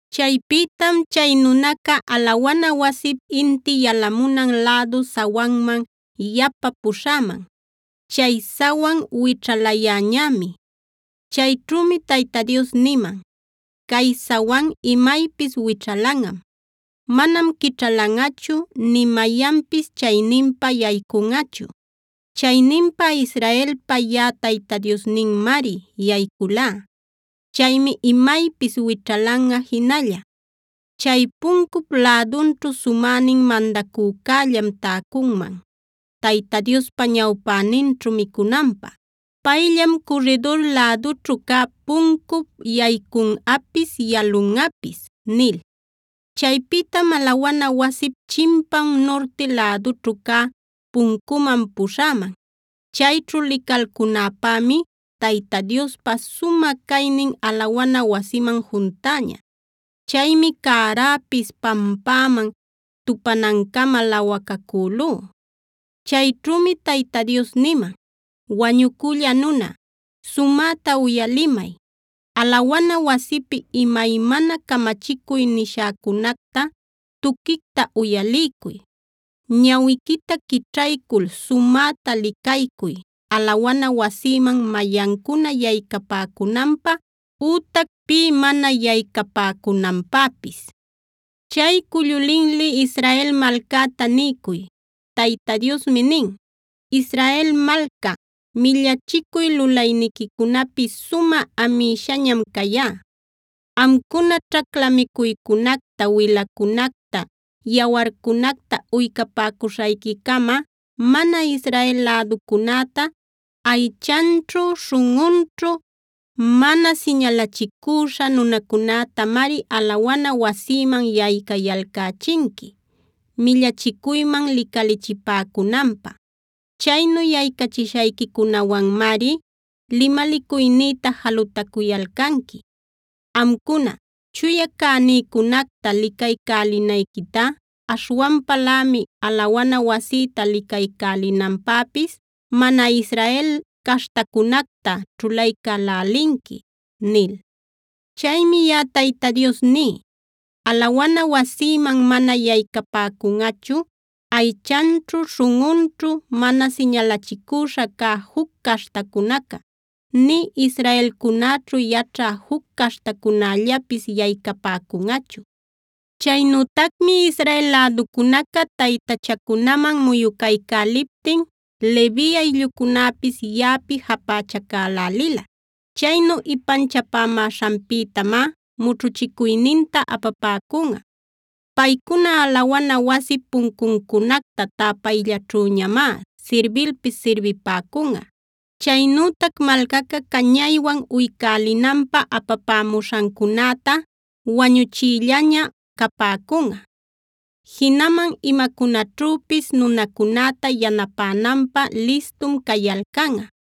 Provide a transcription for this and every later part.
Chaypïtam chay nunaca, alawana wasip inti yalamunan lädu sawanman yapa puśhäman. Chay sawan wićhalayäñämi. Chayćhümi Tayta Dios niman: “Cay sawan imaypis wićhalanꞌam. Manam quićhalanꞌachu, nï mayanpis chayninpa yaycunꞌachu. Chayninpa Israelpa yaꞌa Tayta Diosninmari yayculá. Chaymi imaypis wićhalanꞌa jinalla. Chay puncup lädunćhu sumänin mandacücällam täcunman Tayta Diospa ñawpäninćhu micunanpä. Payllam curridur lädućhu cä puncup yaycunꞌapis, yalunꞌapis” nil. Chaypïtam alawana wasip chimpan nurti lädućhu cä puncuman puśhäman. Chayćhu licalcunäpämi Tayta Diospa sumä caynin alawana wasiman juntäña. Chaymi cäräpis pampäman tupanancama lawacacülú. Chayćhümi Tayta Dios niman: “Wañucülla nuna, sumäta uyalimay. Alawana wasipi imaymana camachicuy nishäcunacta tuquicta uyaliycuy. Ñawiquita quićhaycul sumäta licaycuy alawana wasïman mayancuna yaycapäcunanpä ütac pï mana yaycapäcunanpäpis. Chay cullu linli Israel malcäta niycuy: Tayta Diosmi nin: ‘Israel malca, millachicuy lulayniquicunapi sumä amïshañam cayá. Amcuna ćhacla micuycunacta, wilacunacta, yawarcunacta uycapäcuśhayquicama, mana Israel läducunäta, aychanćhu śhunꞌunćhu mana siñalachicüśha nunacunätamari alawana wasïman yaycayalcächinqui, millachicuyman licalichipäcunanpä. Chaynu yaycachishayquicunawanmari limalicuynïta jalutacuyalcanqui. Amcuna, chuya cänïcunacta licaycälinayquitá aśhwanpalämi alawana wasïta licaycälinanpäpis, mana Israel caśhtacunacta ćhulaycälälinqui’ nil. “Chaymi yaꞌa Tayta Dios ní: Alawana wasïman manam yaycapäcunꞌachu aychanćhu śhunꞌunćhu mana siñalachicüśha cä juc caśhtacunaca, nï israelcunäćhu yaćhä juc caśhtacunällapis yaycapäcunꞌachu. “Chaynütacmi Israel läducunaca taytachacunaman muyucalcäliptin Levi ayllucunäpis yaꞌapi japächacalälila. Chaynu ipanchapämäśhanpïtamá mućhuchicuyninta apapäcunꞌa. Paycuna alawana wasip puncuncunacta täpayllaćhüñamá sirbilpis sirbipäcunꞌa. Chaynütac malcaca cañaywan uycälinanpä apapämuśhancunäta wañuchïllaña capäcunꞌa. Jinaman imacunaćhüpis nunacunäta yanapänanpä listum cayalcanꞌa.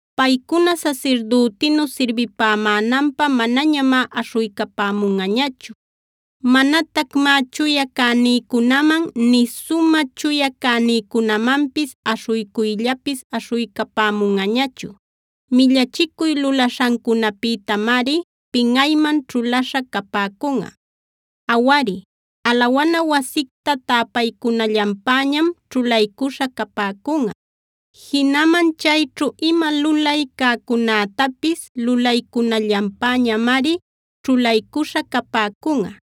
“Paycuna sasirdütinu sirbipämänanpä manañamá aśhuycapämunꞌañachu. Manatacmá chuya cänïcunaman, nï sumä chuya cänïcunamanpis aśhuycuyllapis aśhuycapämunꞌañachu. Millachicuy lulaśhancunapïtamari pinꞌayman ćhulaśha capäcunꞌa. Awari, alawana wasicta täpaycunallanpäñam ćhulaycuśha capäcunꞌa; jinaman chayćhu ima lulay cäcunätapis lulaycunallanpäñamari ćhulaycuśha capäcunꞌa.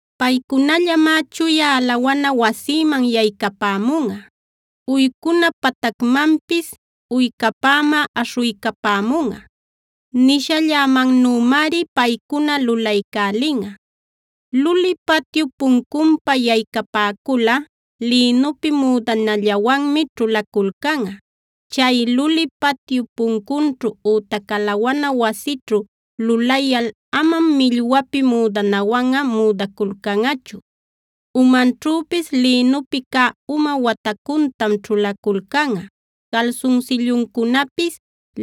Paycunallamá chuya alawana wasïman yaycapämunꞌa; uycuna patacmanpis uycapämä aśhuycapämunꞌa. Nishallämannümari paycuna lulaycälinꞌa. “Luli patyup puncunpa yaycapäculꞌa lïnupi müdanallawanmi ćhulaculcanꞌa. Chay luli patyup puncunćhu ütac alawana wasićhu lulayal amam millwapi müdanawanꞌa müdaculcanꞌachu. Umanćhüpis lïnupi cä uma watacuntam ćhulaculcanꞌa. Calsunsilluncunapis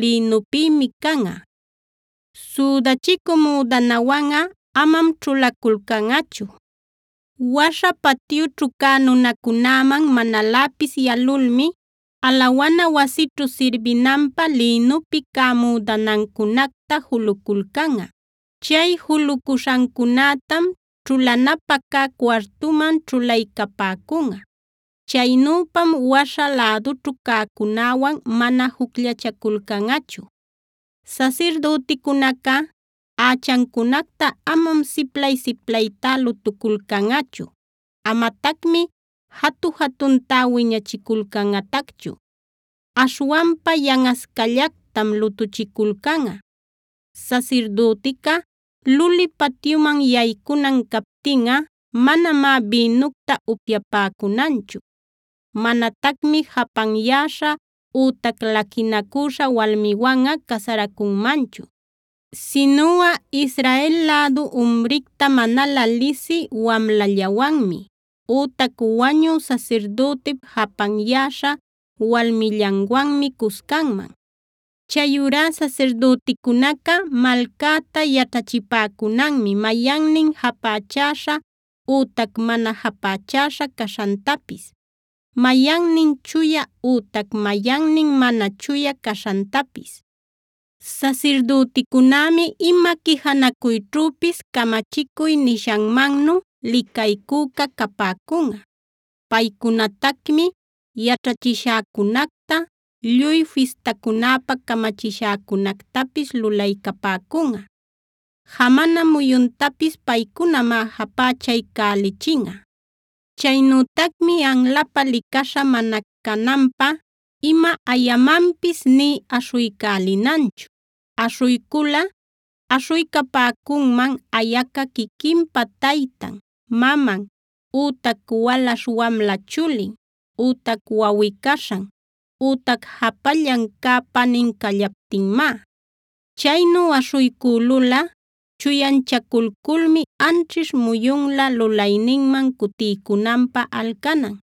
lïnupïmi canꞌa. Südachicü müdanawanꞌa amam ćhulaculcanꞌachu. Waśha patyućhu cä nunacunäman manaläpis yalulmi alawana wasićhu sirbinanpä lïnupi cä müdanancunacta juluculcanꞌa. Chay julucuśhancunätam ćhulanapä cä cuartuman ćhulaycapäcunꞌa. Chaynüpam waśha lädućhu cäcunäwan mana jucllachaculcanꞌachu. “Sasirdüticunaca ächancunacta amam siplay-siplaytá lutuculcanꞌachu. Amatacmi jatu-jatuntá wiñachiculcanꞌatacchu. Aśhwanpa yanꞌascallactam lutuchiculcanꞌa. Sasirdütica luli patyuman yaycunan captinꞌa manamá bïnucta upyapäcunanchu. Manatacmi japanyäśha ütac laquinacüśha walmiwanꞌa casaracunmanchu. Sinuꞌa Israel lädu umricta manalä lisï wamlallawanmi ütac wañü sasirdütip japanyäśha walmillanwanmi cuscanman. Chayurá sasirdüticunaca malcäta yaćhachipäcunanmi mayannin japächäśha ütac mana japächäśha caśhantapis, mayannin chuya ütac mayannin mana chuya caśhantapis. “Sasirdüticunämi ima quijanacuyćhüpis camachicuy nishanmannu licaycüca capäcunꞌa. Paycunatacmi yaćhachishäcunacta, lluy fistacunapä camachishäcunactapis lulaycapäcunꞌa. Jamana muyuntapis paycunamá japächaycälichinꞌa. “Chaynütacmi anlapä licaśha mana cananpä ima ayamanpis nï aśhuycälinanchu. Aśhuyculꞌa aśhuycapäcunman ayaca quiquinpa taytan, maman, ütac walaśh wamla chulin, ütac wawꞌi-caśhan ütac japallan cä panin callaptinmá. Chaynu aśhuycülulꞌa chuyanchaculculmi anćhish muyunlä lulayninman cutiycunanpä alcanan.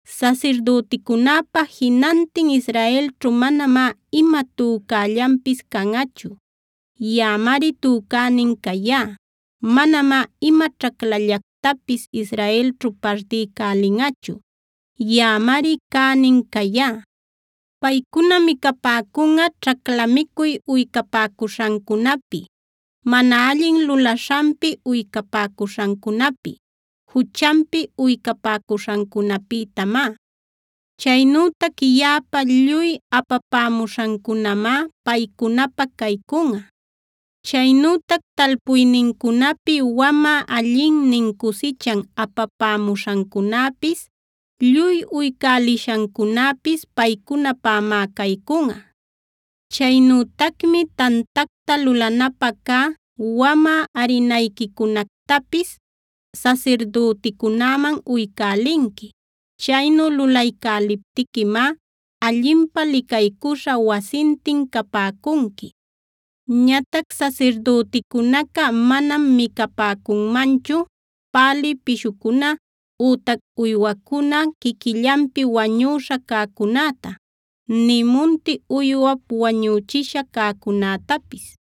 “Sasirdüticunäpa jinantin Israelćhu manamá ima tücällanpis canꞌachu. Yaꞌamari tücänin cayá. Manamá ima ćhaclallactapis Israelćhu partiycälinꞌachu. Yaꞌamari cänin cayá. Paycuna micapäcunꞌa ćhacla micuy uycapäcuśhancunapi, mana allin lulaśhanpi uycapäcuśhancunapi, juchanpi uycapäcuśhancunapïtamá. Chaynütac yaꞌapä lluy apapämuśhancunämá paycunapä caycunꞌa. Chaynütac talpuynincunapi wamä allinnin cusichan apapämuśhancunäpis, lluy uycälishancunäpis paycunapämá caycunꞌa. Chaynütacmi tantacta lulanapä cä wamä arinayquicunactapis sasirdüticunäman uycälinqui. Chaynu lulaycäliptiquimá allinpä licaycuśha wasintin capäcunqui. Ñatac sasirdüticunaca manam micapäcunmanchu pälï pishucuna ütac uywacuna quiquillanpi wañüśha cäcunäta, nï munti uywap wañüchisha cäcunätapis.